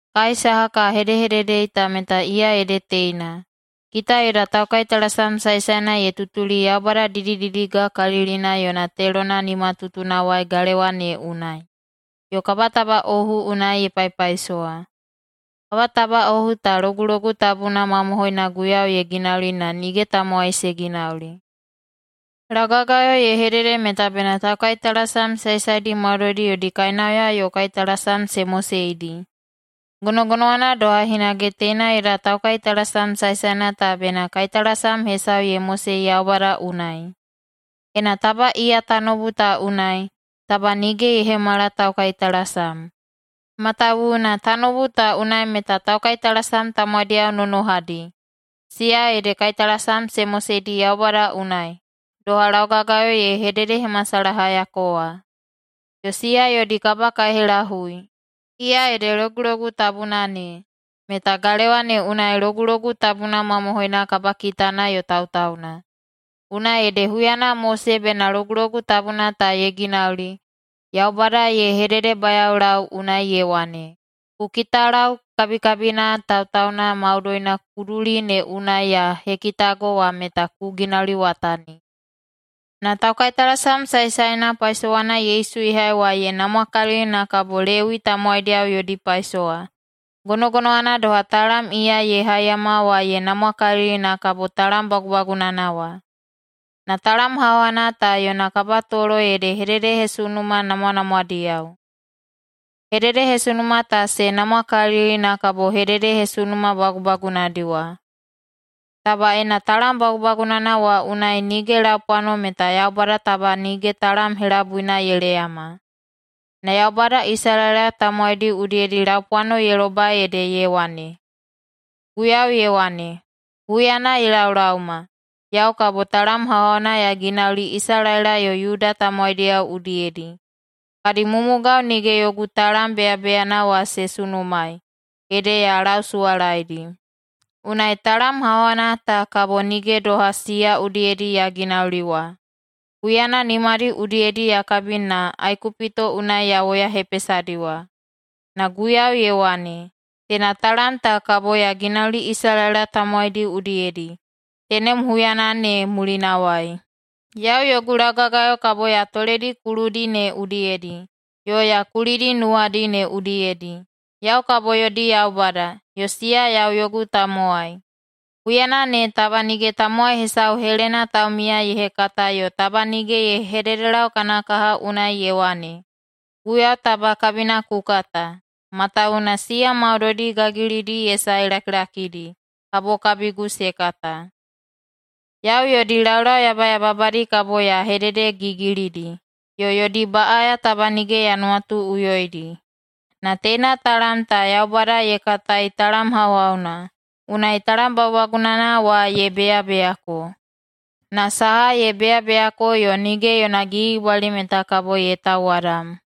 Kai saha ka hedehededei ta meta iya ede teina: Kita yoda taukaitalasam saesaena ye tutuli Yaubada didididigakalilina yona telona nimatutunawai galewa ne unai, yo kabatabaꞌohu unai ye paipaisowa. Kabatabaꞌohu ta Logulogu Tabuna mamohoina Guiyau ye ginauli na nige tamowai se ginauli. Laugagayo ye hedede meta bena taukaitalasam saesaedi maudoidi yodi kainauya yo kaitalasam se moseidi. Gonogonowana doha hinage teina yoda taukaitalasam saesaena ta bena kaitalasam hesau ye mosei Yaubada unai. Ena taba iya tanoubu ta unai, taba nige ye hemala taukaitalasam, matawuwuna tanoubu ta unai meta taukaitalasam tamowaidiyao nonohadi, siya ede kaitalasam se moseidi Yaubada unai, doha laugagayo ye hededehemasalahayako wa. Yo siya yodi kabakaihelahui, iya ede Logulogu Tabuna ne, meta galewa ne unai Logulogu Tabuna mamohoina kabakitana yo tautauna. Unai ede huyana Mose bena Logulogu Tabuna ta ye ginauli, Yaubada ye hededebayaolau unai ye wane, “Ku kitalau kabikabina tautauna maudoina kuduli ne unai ya hekitago wa meta ku ginauliwatani.” Na taukaitalasam saesaena paisowana Yesu ye hai wa ye namwakalili na kabo Lewi tamowaidiyao yodi paisowa, gonogonowana doha talam iya ye haiyama wa ye namwakalili na kabo talam bagubagunana wa. Na talam hauhauna ta yona kabatolo ede hededehesunuma namwanamwadiyao. Hededehesunuma ta se namwakalili na kabo hededehesunuma bagubagunadi wa. Taba ena talam bagubagunana wa unai nige laupwano, meta Yaubada taba nige talam helabuina ye leyama. Na Yaubada Isalaela tamowaidi udiyedi laupwano ye lobai ede ye wane, “Guiyau ye wane, Huyana ye laolaoma, yau kabo talam hauhauna ya ginauli Isalaela yo Yuda tamowaidiyao udiyedi. Kadi mumugao nige yogu talam beyabeyana wa se sunumaei, ede ya lausuwalaedi. Unai talam hauhauna ta kabo nige doha siya udiyedi ya ginauli wa, huyana nimadi udiyedi ya kabi na Aikupito unai ya woyahepesadi wa. Na Guiyau ye wane, Teina talam ta kabo ya ginauli Isalaela tamowaidi udiyedi, tenem huyana ne mulinawai. Yau yogu laugagayo kabo ya toledi kuludi ne udiyedi yo ya kulidi nuwadi ne udiyedi. Yau kabo yodi Yaubada, yo siya yau yogu tamowai. Huyana ne taba nige tamowai hesau helena taumiya ye hekata yo taba nige ye hededelau kana kaha unai ye wane, ‘Guiyau taba kabina ku kata,’ matawuwuna siya maudoidi gagilidi ye sae lakilakidi kabo kabigu se kata. Yau yodi laulau yabayababadi kabo ya hededegigilidi yo yodi baꞌaya taba nige ya nuwatuꞌuyoidi.” Na teina talam ta Yaubada ye katai talam hauhauna, unai talam bagubagunana wa ye beyabeyako. Na saha ye beyabeyako yo nige yona gigibwali meta kabo ye tauwadam.